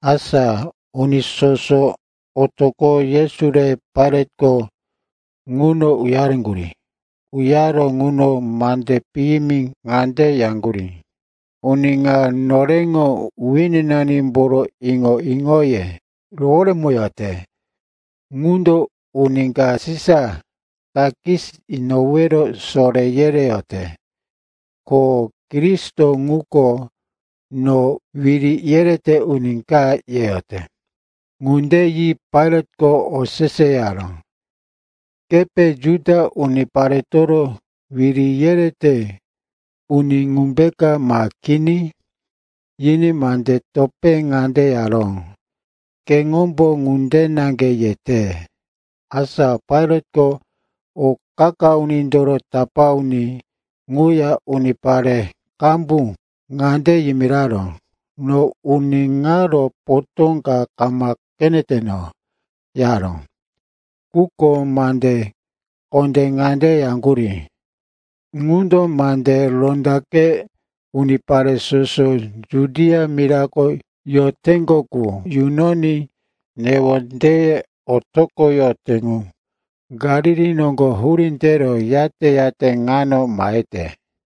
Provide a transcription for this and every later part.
Asa uni soso otoqoro Yesu re Pailatko ŋuno uyareŋgurí. Uyaro ŋuno mande piyimi ŋande yaŋgurí, “Uni ŋa noreŋo wininanimboro iŋo-iŋoye roworemoyote. Ŋundo uni ka Sisa takis inowero soré yereyote. Ko, ‘Kristo ŋuko no, wiri yerete uni ka,’ yeyote.” Ŋunde yi Pailatko oseseyaró, “Kepe Juda uniparetoro wiri yerete uni ŋumbe, ma kini?” Yiní mande topé ŋande yaró, “Keŋombo ŋunde naŋge yete.” Asa Pailatko o qa-qa unindoro tapá uni ŋuya unipare qambu ŋande yimiraró, “No uni ŋaro potó ka kama qeneteno,” yaró. Quko mande kondé ŋande yaŋgurí, “Ŋundo mande rondaqe unipare soso Judia mirako yoteŋgo qu yunoní newondeye otoqoyote ŋu. Galili noŋgo hurí tero, yate-yate ŋano mahete.”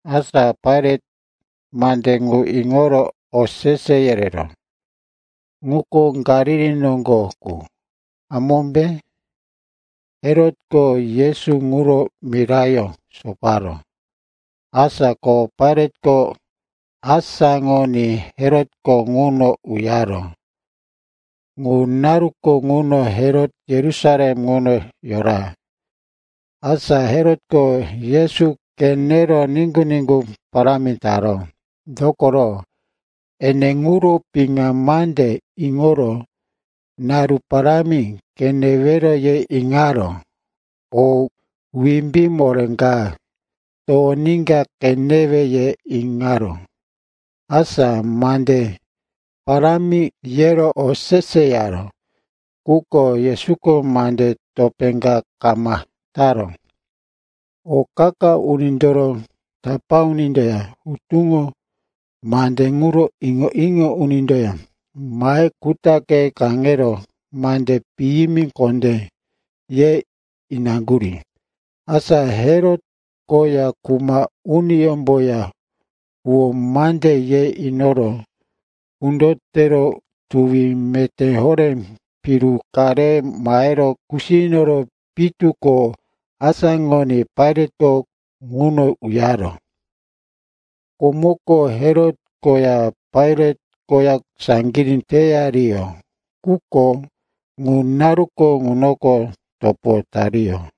Asa Pailat mande ŋu iŋoro osese yereró, “Ŋuko Galili noŋgo qu, hamómbe?” Herotko Yesu ŋuro mirayó soparó. Asa ko Pailatko asáŋoní Herotko ŋuno uyaró. Ŋu naruko ŋuno Herot Yerusalem ŋuno yora. Asa Herotko Yesu qenero niŋgu-niŋgu parámi taró. Dokoro ene ŋuro piŋa mande iŋoro, naru parámi qenewero ye iŋaró. O wimbí moré ka towoníka qenewe, ye iŋaró. Asa mande parámi yero oseseyaró, quko Yesuko mande topé ka kama taró. O qa-qa unindoro tapá unindoya hutuŋo mande ŋuro iŋo-iŋo unindoya mahe kutaqe kaŋero mande piyimi kondé ye inaŋgurí. Asa Herot koya kuma uniyómboya huwó mande ye inoro kundo tero tuwi meté horé piru ka re mahero kusiyo inoro, pitu ko asáŋoní Pailatko ŋuno uyaró. Komoko Herot koya Pailat koya saŋgirí teyariyó. Quko ŋu naruko ŋunoko topo tariyó.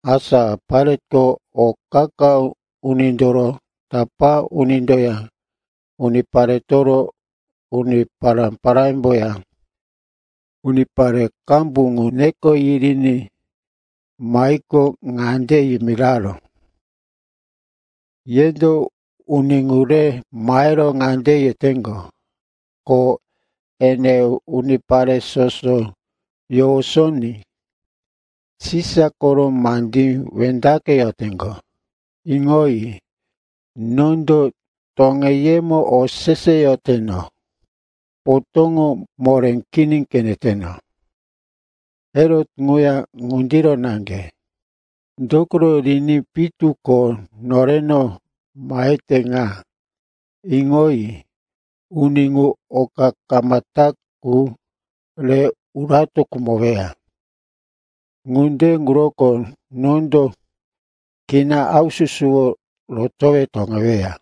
Asa Pailatko o qa-qa unindoro tapá unindoya uniparetoro uni pará-parámboya unipare qambu ŋu neko yiriní mahiqo, ŋande yimiraró, “Yendo uni ŋu re mahero ŋande yeteŋgo, ko ene unipare soso yowosoní Sisa koro mandí wendaqeyoteŋgo. Iŋoyi, nondo toŋeyemo oseseyoteno, potóŋo moré kini qeneteno. Herot ŋuya ŋundiro naŋge, dokoro riní pitu ko noreno mahete ŋa. Iŋoyi, uni ŋu oka kama ta qu re urato khumoweya. Ŋunde ŋuroko nondo kina haususuworo rotowe toŋeweya.”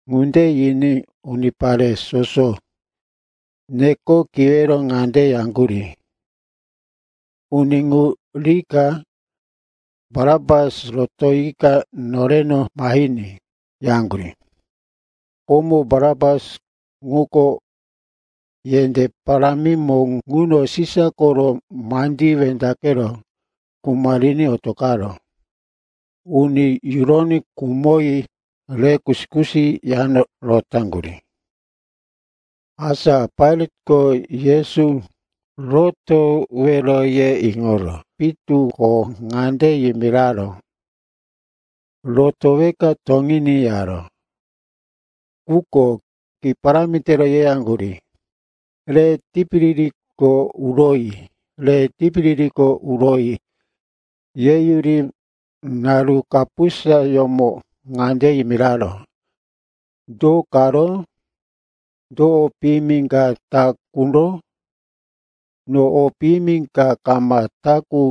Ŋunde yiní unipare soso neko kiwero ŋande yaŋgurí, “Uni ŋu rika Barapas rotoyika noreno mahiní,” yaŋgurí. Komo Barapas ŋuko yendé parámimo ŋuno Sisa koro mandí wendaqero kuma riní otoqaró. Uni yuroní khumoyi rero kusi-kusi yano rotaŋgurí. Asa Pailatko Yesu rotowero ye iŋoro pitu ko ŋande yimiraró, “Rotoweka toŋiní,” yaró. Quko ki parámi tero yeyaŋgurí, “Re tipiririko uroyi! Re tipiririko uroyi!” Yeyuri, naru kapusayómo ŋande yimiraró, “Do karo? Do o piyimi ka ta quro? No o piyimi ka kama ta qu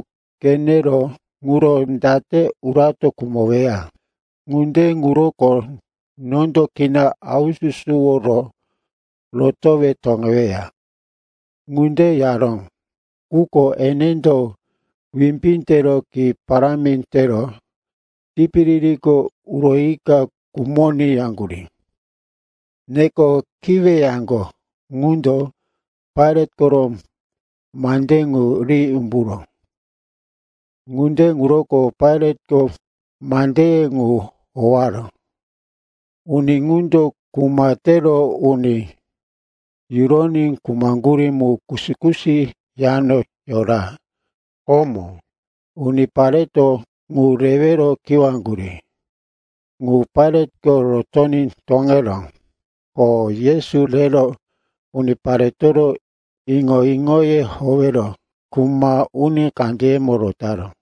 qenero ŋuro date urato khumoweya. Ŋunde ŋuroko nondo kina haususuworo rotowe toŋeweya.” Ŋunde yaró, quko enendo wimbí tero, ki parámi tero, tipiririko uroyika khumoní, yaŋgurí. Neko kiweyaŋgo ŋundo Pailat koro mande qu ri umburó. Ŋunde ŋuroko Pailatko mandeye ŋu howaró. Uni ŋundo, kuma tero uni yuroní khumaŋgurí mu kusi-kusi yano yora, komo unipareto ŋu rewero kiwaŋgurí, ŋu Pailatko rotoní toŋeró. Ko Yesu rero uniparetoro iŋo-iŋoye howero kuma uni kandeyemo rotaró.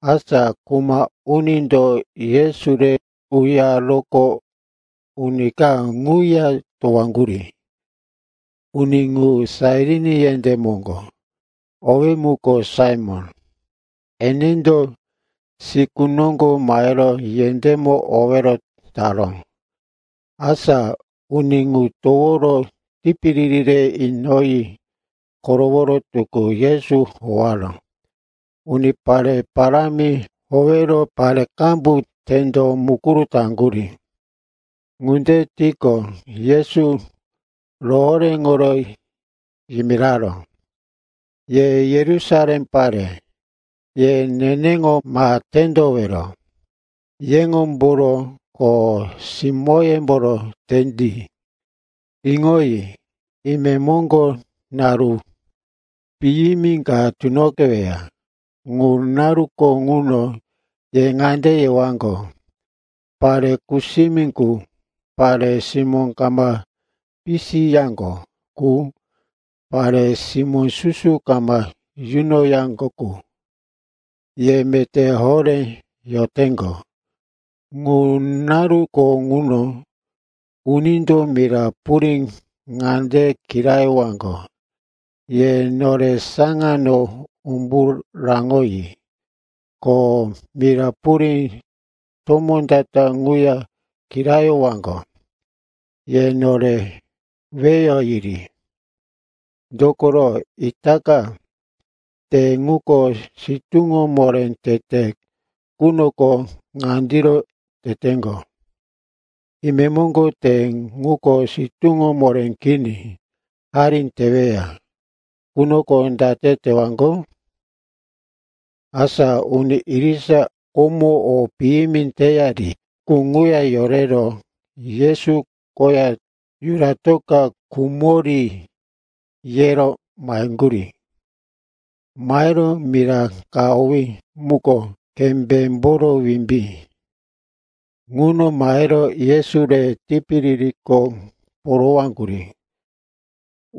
Asa kuma unindo Yesu re uyaroqo, uni ka ŋuya towaŋgurí. Uni ŋu Sairin yendé moŋgo, owí muko Saimon. Enendo siku noŋgo mahero yendémo owero taró. Asa uni ŋu toworo tipiriri re inoyi koroworo tukú Yesu howaró. Unipare parámi howero pare qambu tendo mukuru taŋgurí. Ŋunde tiqo, Yesu rohoréŋoro yimiraró, “Ye Yerusalem pare, ye neneŋo ma tendowero. Yeŋomboro ko simóyemboro tendi. Iŋoyi, imemo naru piyimi ka tunoqeweya. Ŋu naruko ŋuno ye ŋande yewaŋgo, ‘Pare kusimi ŋu, pare simó kama pisiyaŋgo qu, pare simó susu kama yunoyaŋgo qu, ye meté horé yoteŋgo.’ Ŋu naruko ŋuno “‘unindo mira purí ŋande kirayowaŋgo, “Ye nore saŋano umbu raŋoyi!” ko mira purí tomó ta-ta ŋuya kirayowaŋgo, “Ye nore weyo yiri!”’ “Dokoro itaka, te ŋuko sitúŋo moré tete qunoko ŋandiro teteŋgo. Imemoŋgo, te ŋuko sitúŋo moré kini, hari teweya qunoko date tewaŋgo?” Asa uni irisa komo o piyimi teyari ŋuya yorero, Yesu koya yuratoka khumori, yero maheŋgurí. Mahero mira ka owí muko Kembémboro Wimbí ŋuno mahero Yesu re tipiririko porowaŋgurí.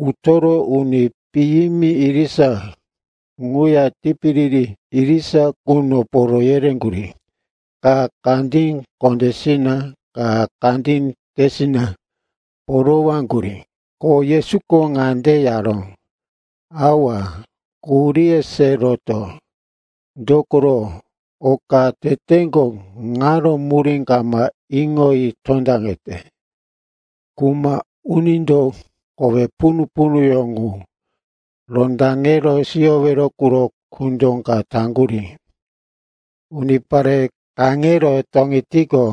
Utoro uni piyimi irisa ŋuya tipiriri irisa ŋuno poro yereŋgurí, ka kandí kondésina, ka kandí tesina porowaŋgurí. Ko Yesuko ŋande yaró, “Awa, quhuríye se roto. Dokoro oka teteŋgo ŋaro murí kama iŋoyi tondaŋete.” Kuma unindo kowe punu-punuyó ŋu rondaŋe siyowero quro kundo ka taŋgurí. Unipare kaŋero toŋetiqo,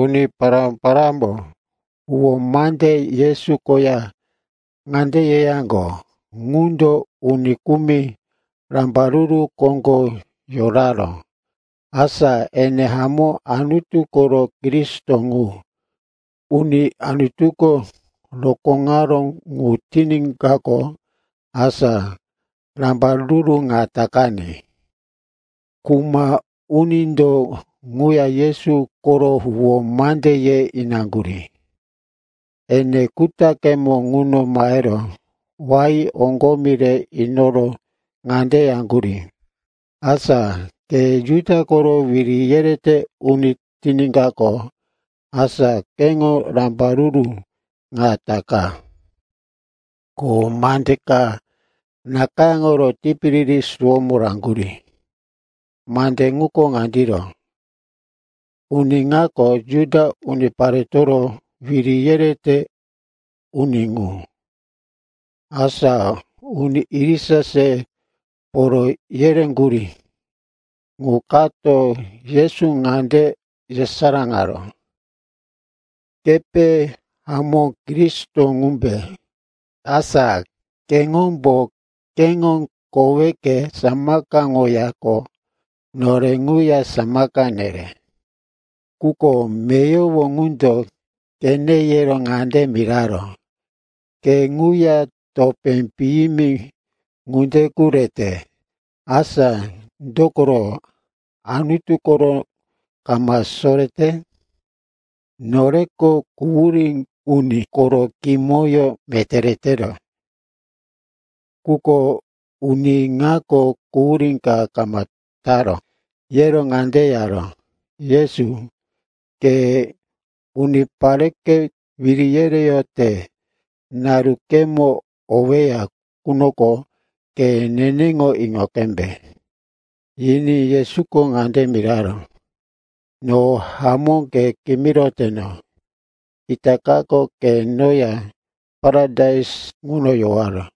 uni pará-parámbo huwó mande Yesu koya ŋande yeyaŋgo, “Ŋundo uni kumi rambaruru koŋgo yoraró. Asa ene hamó Anutu koro Kristo ŋu, uni Anutuko rokóŋaró ŋu tiníkaqo, asa rambaruru ŋa takaní.” Kuma unindo ŋuya Yesu koro huwó mande ye inaŋgurí. Ene kutaqemo ŋuno mahero, wain oŋgomi re inoro ŋande yaŋgurí, “Asa ke Juda koro wiri yerete uni tiníkaqo, asa keŋo rambaruru ŋa taka.” Ko mande ka nakayáŋoro tipiriri suwómo raŋgurí. Mande ŋuko ŋandiro, “Uni ŋako Juda Uniparetoro Wiri yerete Uni ŋu.” Asa uni irisa se poro yereŋgurí qu kato Yesu ŋande yesaráŋaró, “Kepe hamó Kristo ŋumbe? Asa keŋombo keŋo koweke samakaŋoyaqo, nore ŋuya samaka nere.” Quko meyowo ŋundo qene yero ŋande miraró, “Ke ŋuya topé piyimi ŋunde qu rete. Asa dokoro Anutu koro kama sorete? Noreko quhurí uni koro kimoyó meté retero. Quko uni ŋako quhurí ka kama taró.” Yero ŋande yaró, “Yesu, ke unipareke wiri yereyote narukemo oweya qunoko, ke neneŋo iŋo qembe.” Yiní Yesuko ŋande miraró, “No hamó ke kimiroteno, itakako ke noya paradais ŋuno yowaro.”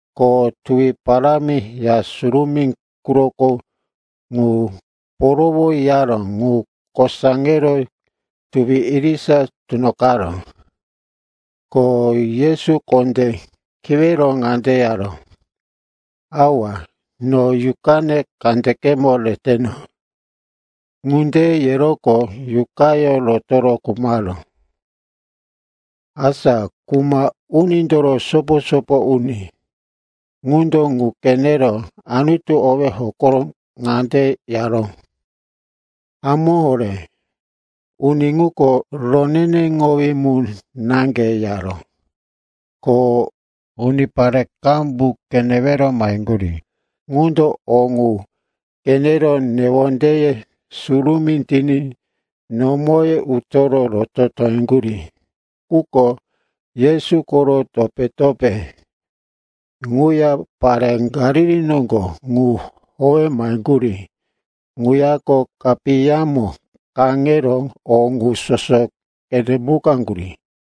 Ko tuwi parámi Ya Surumí quroko qu porowoyaró, ŋu kosaŋero tuwi irisa tunoqaró. Ko Yesu kondé kiwero ŋande yaró, “Awa, no yuqane kandekemo reteno.” Ŋunde yeroqo yuqayó rotoro khumaró. Asa kuma unindoro sopo-sopo uni ŋundo ŋu qenero Anutu owí hokoro ŋande yaró, “Hamó horé, uni ŋuko roneneŋowí mu naŋge,” yaró. Ko unipare qambu qenewero maheŋgurí ŋundo o ŋu qenero newondeye surumí tiní nomoye utoro roto toŋeŋgurí. Quko Yesu koro topé-topé ŋuya pare Galili noŋgo ŋu howe maheŋgurí ŋuyako kapiyamo kaŋero o ŋu soso qenemukaŋgurí.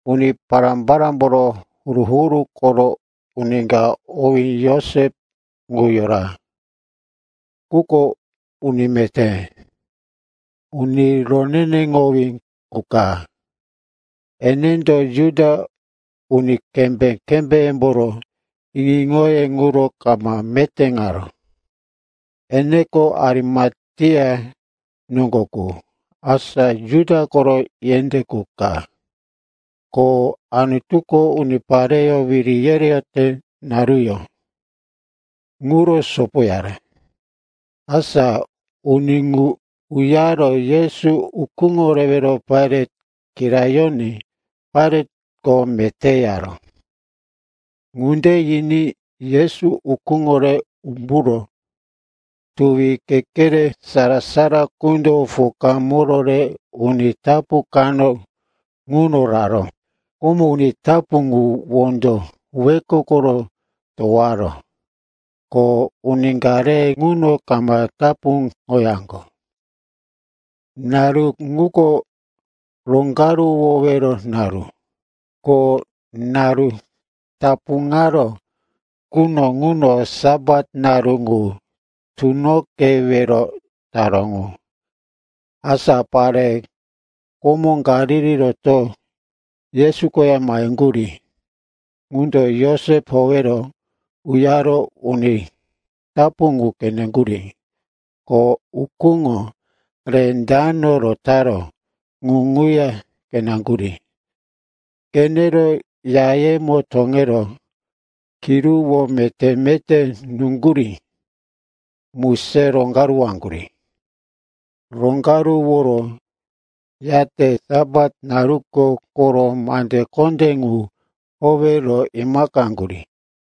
Uni pará-parámboro huru-huru koro uni ka owí Josep ŋu yora. Ŋuko uni meté, uni roneneŋowí qu ka. Enendo Juda uni kembé-kembémboro iŋo-iŋoye ŋuro kama metéŋaró. Eneko Arimatea noŋgo qu, asa Juda koro yendé qu ka, ko Anutuko unipareyó wiri yereyote naruyó ŋuro sopoyaró. Asa uni ŋu uyaro Yesu ukúŋo rewero Pailat kirayoní Pailatko meté yaró. Ŋunde yiní Yesu ukúŋo re umburo tuwi kekere sara-sara qundo pokamoro re uni tapu kano ŋuno raró. Komo uni tapu ŋu wondo wekokoro towaró, ko uni ka re ŋuno kama tapuŋoyaŋgo. Naru ŋuko Roŋgaruwowero Naru, ko naru tapuŋaró quno ŋuno Sapat naru ŋu tunoqewero taró ŋu. Asa pare komo Galili rotoro Yesu koya maheŋgurí ŋundo Josep howero uyaro uni tapu ŋu qeneŋgurí. Ko ukúŋo re dano rotaró ŋu ŋuya qeneŋgurí. Qenero yayemo toŋero kiruwó meté-meté nuŋgurí mu se roŋgaruwaŋgurí. Roŋgaruworo, yate Sapat naruko koro mande kondé ŋu howero imaqaŋgurí.